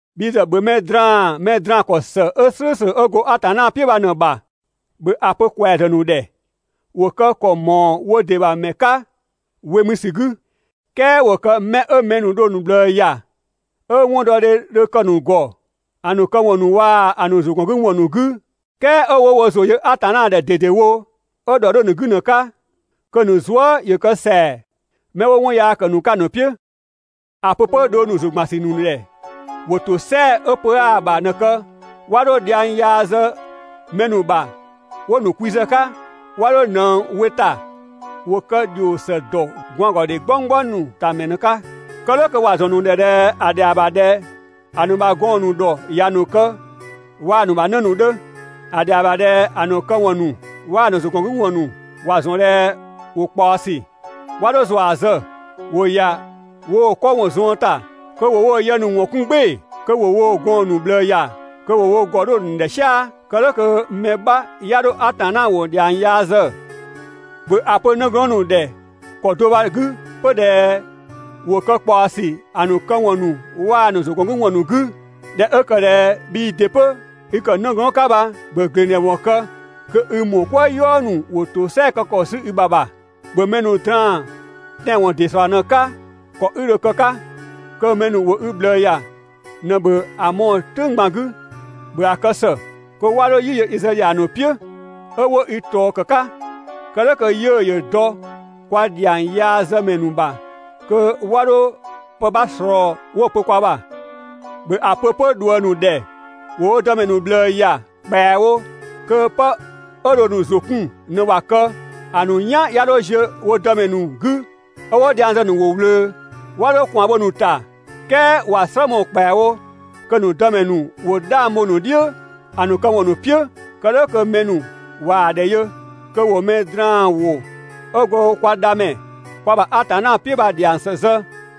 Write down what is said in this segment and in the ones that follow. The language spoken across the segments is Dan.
Bhi ‑zë ‑bhö mɛ draan‑ mɛ draan‑ ‑kɔ ‑së 'ö "slʋ̈ʋ̈slʋ̈ 'ö go Atanna "piʋ̈ bha ꞊në‑ ‑bha. ‑Bhö ‑a pö ‑kwɛazë ‑nu ‑dhɛ ‑wo kë ‑kɔ ‑mɔɔ wo ‑dɩ ‑bha ‑mɛ 'ka (we mü ‑sü 'gü), "kɛɛ ‑wo kë 'mɛ 'ö mɛ ‑nu dho‑ ‑nu ꞊bhlëë ‑ya, 'ö 'wɔndɔdhe 'dhö‑ ‑nu ‑gɔ ‑a ‑nu këwɔn ‑nu waa‑ ‑a ‑nu ‑zʋgɔngüwɔn ‑nu 'gü, "kɛɛ 'ö 'wo wo ‑zʋ yö Atanna ‑dhɛ ꞊dedewo, 'ö ‑dhɔ 'dhö‑ ‑nu 'gü ꞊në‑ 'ka, kö‑ ‑nu zuë" ‑yö kë ‑sɛa 'mɛ 'wo 'wɔn yaa ‑kë ‑nu 'ka ‑a ‑nu "piʋ̈. ‑A pö 'pö dhong ‑nu ‑zʋgbansü ‑nu ‑dhɛ ‑wo ‑tosɛa 'ö pö 'aa‑ ‑bha ꞊në‑ kë, 'wa 'dho dhiang yaa zë mɛ ‑nu ‑bha 'wo‑ ‑nu kwi zë‑ 'ka, 'wa 'dho ꞊nëng we ‑ta, ‑wo kë ‑dhio ‑së ‑dɔ gwaangɔdhe "gbɔnggbɔng ‑nu ‑ta ‑mɛ ꞊në‑ 'ka. Kë "dhʋ̈ kö ‑wa ‑zɔn ‑nu ‑dhɛ ꞊dhɛ ‑a ‑dhɛa ‑bha ꞊dhɛ ‑a ‑nu ‑bha gɔɔn‑ ‑nu ‑dhɔ ‑ya ‑nu kë waa‑ ‑nu ‑bha 'në ‑nu 'dhö. ‑A ‑dhɛa ‑bha ꞊dhɛ ‑a ‑nu këwɔn ‑nu waa‑ ‑nu ‑zʋgɔngüwɔn ‑nu ‑wa ‑zɔn ꞊dhɛ ‑wo ꞊kpaɔsü. 'Wa 'dho ‑zua zë, ‑wo ‑ya woo‑ 'kɔ ‑wɔn zuën ‑ta kö ‑wo woo‑ yë ‑nu ‑wɔn 'kun "gbɩɩ‑, kö ‑wo woo‑ gɔɔn‑ ‑nu ꞊bhlëë ‑ya, kö ‑wo wo ‑gɔ 'dho‑ ‑nu ‑dhɛ "sia‑, kë "dhʋ̈ kö mɛ 'bha 'ya 'dho Atanna ‑wʋ ‑dhiang yaa zë. ‑Bhö ‑a pö 'nëglɔɔn ‑nu ‑dhɛ ‑kɔ do bha‑ 'gü 'pö ꞊dhɛ ‑wo kë ꞊kpaɔsü ‑a ‑nu këwɔn ‑nu waa‑ ‑nu ‑zʋgɔngüwɔn ‑nu 'gü. (꞊Dhɛ 'ö ‑kë ꞊dhɛ bhii ‑dɩ 'pö i ‑kë 'nëglɔɔnnë 'ka bha,) ‑bhö ‑gleng ‑dhɛ ‑wɔn kë kö i ‑mɔɔ "kwëë "yɔɔ ‑nu ‑wo ‑tosɛa kë ‑kɔ 'sü i ‑bha ‑bha. ‑Bhö mɛ ‑nu draan‑ tɛanwɔn ‑dɩ ‑slɔɔ ꞊në‑ 'ka, ‑kɔ 'i dho‑ kë‑ 'ka kö mɛ ‑nu ‑wo i ꞊bhlëë ‑ya ꞊në ‑bhö ‑a mɔɔ‑ "tʋ̈ng ꞊gban 'gü. ‑Bhö ‑a kë ‑së kö 'wa 'dho "yi yö i zë ‑dhiang ‑nu "piʋ̈ 'ö 'wo i ꞊tɔɔ ‑kë 'ka, kë "dhʋ̈ kö 'yiʋ̈‑ ‑yö dɔ kwa ‑dhiang yaa zë ‑mɛ ‑nu ‑bha kö 'wa 'dho pë 'bha ꞊slɔɔ 'wo‑ pö kwa ‑bha. ‑Bhö ‑a pö 'pö ꞊dhuëng ‑nu ‑dhɛ ‑wo wo dëmɛ ‑nu ꞊bhlëë ‑ya ‑kpɛawo kö 'pë 'ö dho‑ ‑nu ‑zʋ 'kun ꞊në ‑wa kë, ‑a ‑nu "yan 'ya 'dho ziö wo dëmɛ ‑nu 'gü ('ö 'wo dhiang zë‑ ‑nu ‑wʋ ꞊wlöö). 'Wa 'dho ꞊kwaan bho‑ ‑nu ‑ta, "kɛɛ ‑wa "slë mɔɔ‑ ‑kpɛawo kö‑ ‑nu dëmɛ ‑nu ‑wo 'dhang bho‑ ‑nu "dhiʋ̈ ‑a ‑nu këwɔn ‑nu "piʋ̈. Kë "dhʋ̈ kö mɛ ‑nu ꞊waa‑ ‑dhɛ yö kö ‑wo mɛ draan ‑wʋ 'ö go kwa Dhamɛ, kwa ‑bha Atanna "piʋ̈ bha‑ ‑dhiang ‑së zë.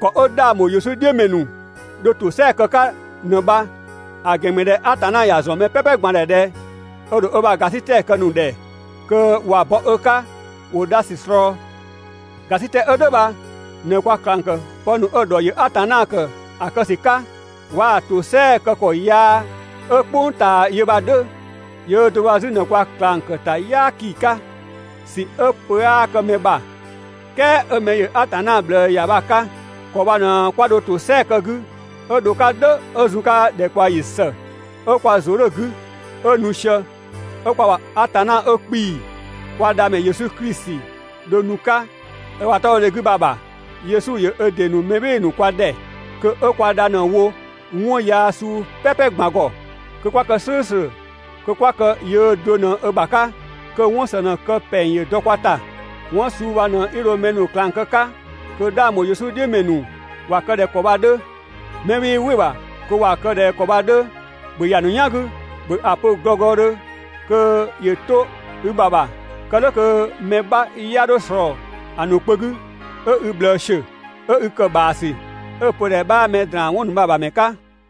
(‑Kɔ 'ö 'dhang ‑bho Yesu "dhiʋ̈ ‑mɛ ‑nu dho ‑tosɛa kë‑ 'ka ꞊në bha.) ‑A ‑gɛn ‑mü ꞊dhɛ Atanna ‑ya ‑zɔn mɛ "pɛpɛ ꞊gban ‑dhɛ ꞊dhɛ ö ‑dho ö ‑bha ‑gasitɛ kë‑ ‑nu ‑dhɛ kö ꞊wa bɔ ö 'ka ‑wo dha ‑sü ꞊slɔɔ. ‑Gasitɛ 'ö "dhʋ̈ bha ꞊në kwa ꞊klang ‑kë pë ‑nu 'ö‑ ‑dhɔ ‑yö Atanna ‑kë ‑a kë ‑sü 'ka, waa‑ ‑tosɛa kë ‑kɔ yaa 'ö "kpʋng ꞊taa yö bha‑ 'dhö. Yöö do bha 'zü ꞊në kwa ꞊klang ‑kë ‑ta "yaaki 'ka ‑sü 'ö pö 'aa kë mɛ ‑bha, "kɛɛ 'ö mɛ ‑yö Atanna ꞊bhlëë ‑ya bha‑ 'ka. ‑Kɔ bha ꞊në 'kwa dho ‑tosɛa kë‑ 'gü 'ö dho‑ 'ka "dhʋ̈ 'ö zun‑ 'ka ‑dhɛkpaɔyi ‑së 'ö kwa ‑zʋ 'dhö‑ 'gü, 'ö nu sië, 'ö kwa ‑bha Atanna 'ö 'kpii‑, kwa Dhamɛ Yesu Klisi dho nu‑ 'ka ö ‑bha 'tɔbhɔdhe 'gü bha‑ ‑bha. Yesu ‑yö ö ‑dɩ ‑nu mɛ "bhɩɩ‑ ‑nu kwa ‑dhɛ kö 'ö kwa dha ꞊në‑ wo 'wɔn yaa suu "pɛpɛ ꞊gban ‑gɔ, kö 'kwa kë "slʋ̈ʋ̈slʋ̈, kö 'kwa kë yöö do ꞊në ö ‑bha 'ka, kö 'wɔn ‑së ꞊në‑ kë ‑pɛng ‑yö dɔ kwa ‑ta. 'Wɔn suu bha ꞊në 'i dho mɛ ‑nu ꞊klang kë‑ 'ka kö 'dhang ‑bho Yesu "dhiʋ̈ ‑mɛ ‑nu ‑wa kë ꞊dhɛ ‑kɔ bha‑ 'dhö. 'Mɛ 'wii "wɩ‑ ‑bha kö ‑wa kë ꞊dhɛ ‑kɔ bha‑ 'dhö, ‑bhö ‑ya ‑nu "yan 'gü, ‑bhö ‑a pö glɔglɔdhö kö ‑yö 'to i ‑bha ‑bha, kë "dhʋ̈ kö mɛ 'bha 'ya 'dho ꞊slɔɔ‑ ‑nu kpö 'gü 'ö i ꞊bhlëë ‑siö, 'ö 'i ‑kë ‑bhaasü, 'ö‑ pö ꞊dhɛ 'bhaa mɛ ‑draan 'wɔn ‑nu bha‑ ‑bha ‑mɛ 'ka.